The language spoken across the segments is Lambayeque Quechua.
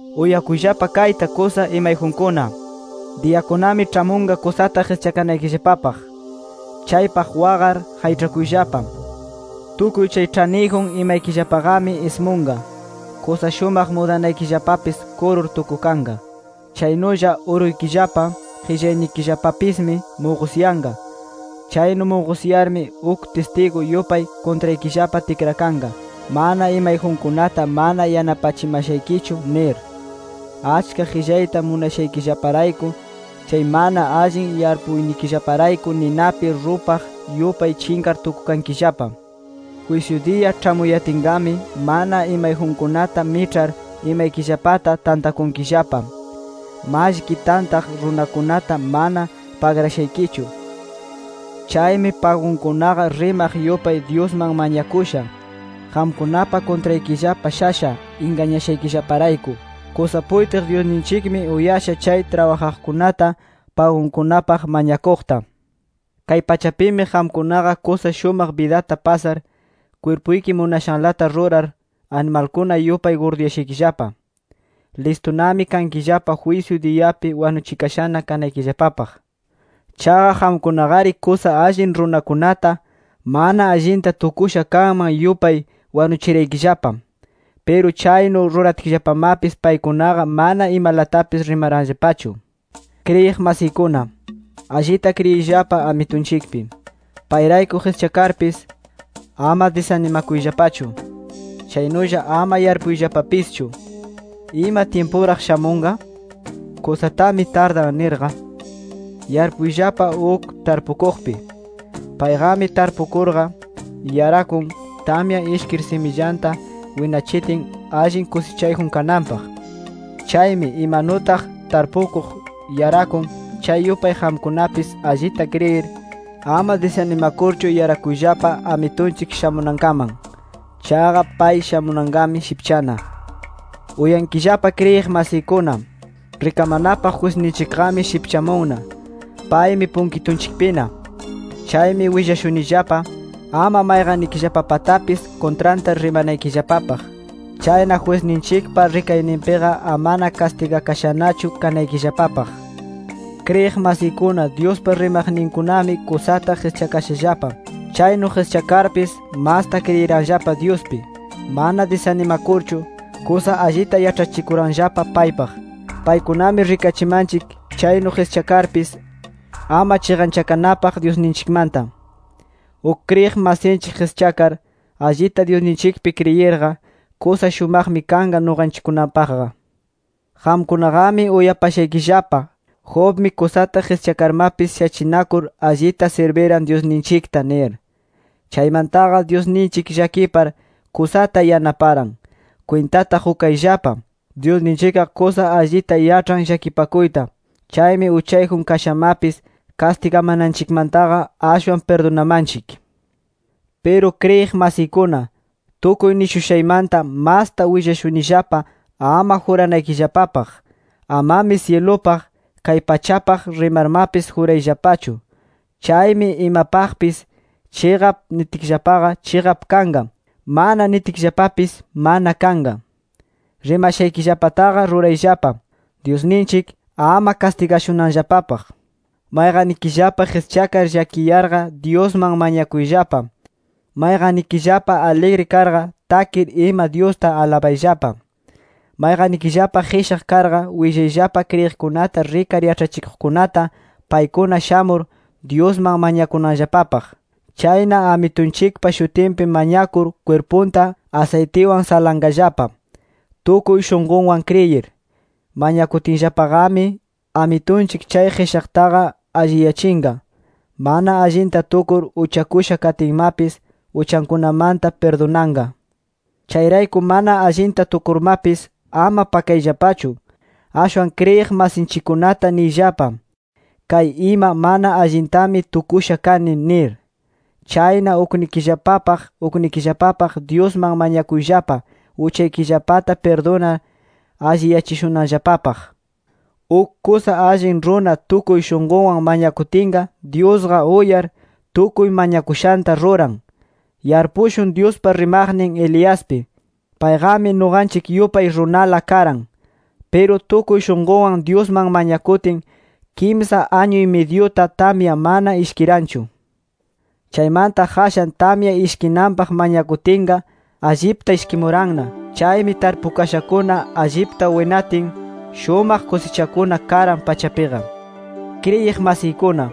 ¡Uyakuyllapa kayta kusa imayjunkuna! Diyakunami ĉhamunqa kusata qischakanaykillapapaq. Chaypaq waqar, qayĉhakuyllapa. Tukuy chay ĉhaniyjun imaykillapaqami ismunqa, kusa shumaq mudanaykillapapis kurur tukukanqa. Chaynulla uruykillapa, qillaynikillapapismi muqusyanqa. Chaynu muqusyarmi uk tistigu yupay kuntraykillapa tikrakanqa: “Mana imayjunkunata mana yanapachimashaykichu” nir. Achka qillayta munashaykillaparayku, chay mana allin yarpuynikillaparayku ninapi rupaq yupay chinqar tukukankillapa. Jwisyu diya ĉhamuyatinqami, mana imayjunkunata miĉhar, imaykillapata tantakunkillapa. Mallki tantaq runakunata mana pagrashaykichu. Chaymi pagunkunaqa rimaq yupay, Dyusman mañakusha. Qamkunapa kuntraykillapa shasha, ingañashaykillaparayku. Kusa puytiq Dyusninchikmi uyasha chay trabajaqkunata, pagunkunapaq mañakuqta. Kay pachapimi qamkunaqa kusa shumaq bidata pasar, kwirpuyki munashanlata rurar, animalkuna yupay gurduyashaykillapa. Listunami kankillapa jwisyu diyapi wanuchikashana kanaykillapapaq. Chaqa qamkunaqari kusa allin runakunata, mana allinta tukusha kanman yupay, wanuchiraykillapa. Piru chaynu ruratkillapamapis paykunaqa mana imalatapis rimaranllapachu. Kriyiq masiykuna, allita kriyiyllapa Amitunchikpi. Payrayku qischakarpis, ama disanimakuyllapachu. Chaynulla ama yarpuyllapapischu: ¿Ima tyimpuraq shamunqa? Kusatami tardan nirqa. Yarpuyllapa uk tarpukuqpi. Payqami tarpukurqa, yarakun, tamya ishkir simillanta winachitin, allin kusichayjun kananpaq. Chaymi, imanutaq tarpukuq yarakun, chay yupay qamkunapis allita kriyir, ama disanimakurchu yarakuyllapa Amitunchik shamunankaman. Chaqa pay shamunanqami shipchana. Uyankillapa kriyiq masiykuna. Rikamanapaq jwisninchikqami shipchamunna. Paymi punkitunchikpina. Chaymi willashunillapa, ama mayqannikillapapatapis kuntranta rimanaykillapapaq. Chayna jwisninchikpa rikayninpiqa amana kastigakashanachu kanaykillapapaq. Kriyiq masiykuna, Dyuspa rimaqninkunami kusata qischakashallapa. Chaynu qischakarpis, masta kriyiranllapa Dyuspi. Mana disanimakurchu, kusa allita yaĉhachikuranllapa paypaq. Paykunami rikachimanchik, chaynu qischakarpis, ama chiqanchakanapaq Dyusninchikmanta. Uk kriyiq masinchik qischakar, allita Dyusninchikpi kriyirqa, kusa shumaqmi kanqa nuqanchikkunapaqqa. Qamkunaqami uyapashaykillapa, Jobmi kusata qischakarmapis shachinakur allita sirbiran Dyusninchikta nir. Chaymantaqa Dyusninchik llakipar, kusata yanaparan. Kwintata qukayllapa: Dyusninchikqa kusa allita yaĉhan llakipakuyta. Chaymi uchayjun kashamapis, kastigamananchikmantaqa ashwan pirdunamanchik. Piru kriyiq masiykuna, tukuy nishushaymanta masta willashunillapa ama juranaykillapapaq. Amami syilupaq, kay pachapaq rimarmapis jurayllapachu. Chaymi imapaqpis “Chiqap” nitkillapaqa, chiqap kanqa. “Mana” nitkillapapis, mana kanqa. Rimashaykillapataqa rurayllapa, Dyusninchik ama kastigashunanllapapaq. Mayqannikillapa qischakar llakiyarqa, Dyusman mañakuyllapa. Mayqannikillapa aligri karqa takir ima Dyusta alabayllapa. Mayqannikillapa qishaq karqa, willayllapa kriyiqkunata rikar yaĉhachikuqninkunata, paykuna shamur, Dyusman mañakunanllapapaq. Chayna Amitunchikpa shutinpi mañakur kwirpunta asaytiwan salanqallapa. Tukuy shunqunwan kriyir, mañakutinllapaqami, Amitunchik chay qishaqtaqa alliyachinqa. Mana allinta tukur uchakusha katinmapis, uchankunamanta pirdunanqa. Chayrayku mana allinta tukurmapis, ama pakayllapachu. Ashwan kriyiq masinchikkunata niyllapa: “Kay ima mana allintami tukusha kani” nir. Chayna uknikillapapaq uknikillapapaq Dyusman mañakuyllapa, uchaykillapata pirdunar, alliyachishunanllapapaq. Uk kusa allin runa tukuy shunqunwan mañakutinqa, Dyusqa uyar, tukuy mañakushanta ruran. Yarpushun Dyuspa rimaqnin Eliaspi. Payqami nuqanchik yupay runala karan. Piru tukuy shunqunwan Dyusman mañakutin, kimsa añu-y-midyuta tamya mana ishkiranchu. Chaymanta qashan tamya ishkinanpaq mañakutinqa, allipta ishkimuranna. Chaymi tarpukashakuna allipta winatin, shumaq kusichakuna karan pachapiqa. Kriyiq masiykuna,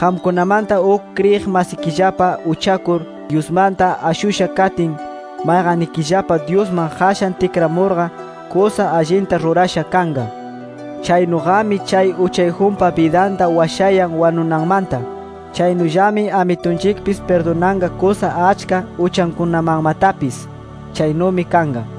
qamkunamanta uk kriyiq masikillapa uchakur, Dyusmanta ashusha katin, mayqannikillapa Dyusman qashan tikramurqa, kusa allinta rurasha kanqa. Chaynuqami chay uchayjunpa bidanta washayan wanunanmanta. Chaynullami Amitunchikpis pirdunanqa kusa achka uchankunamanmatapis. Chaynumi kanqa.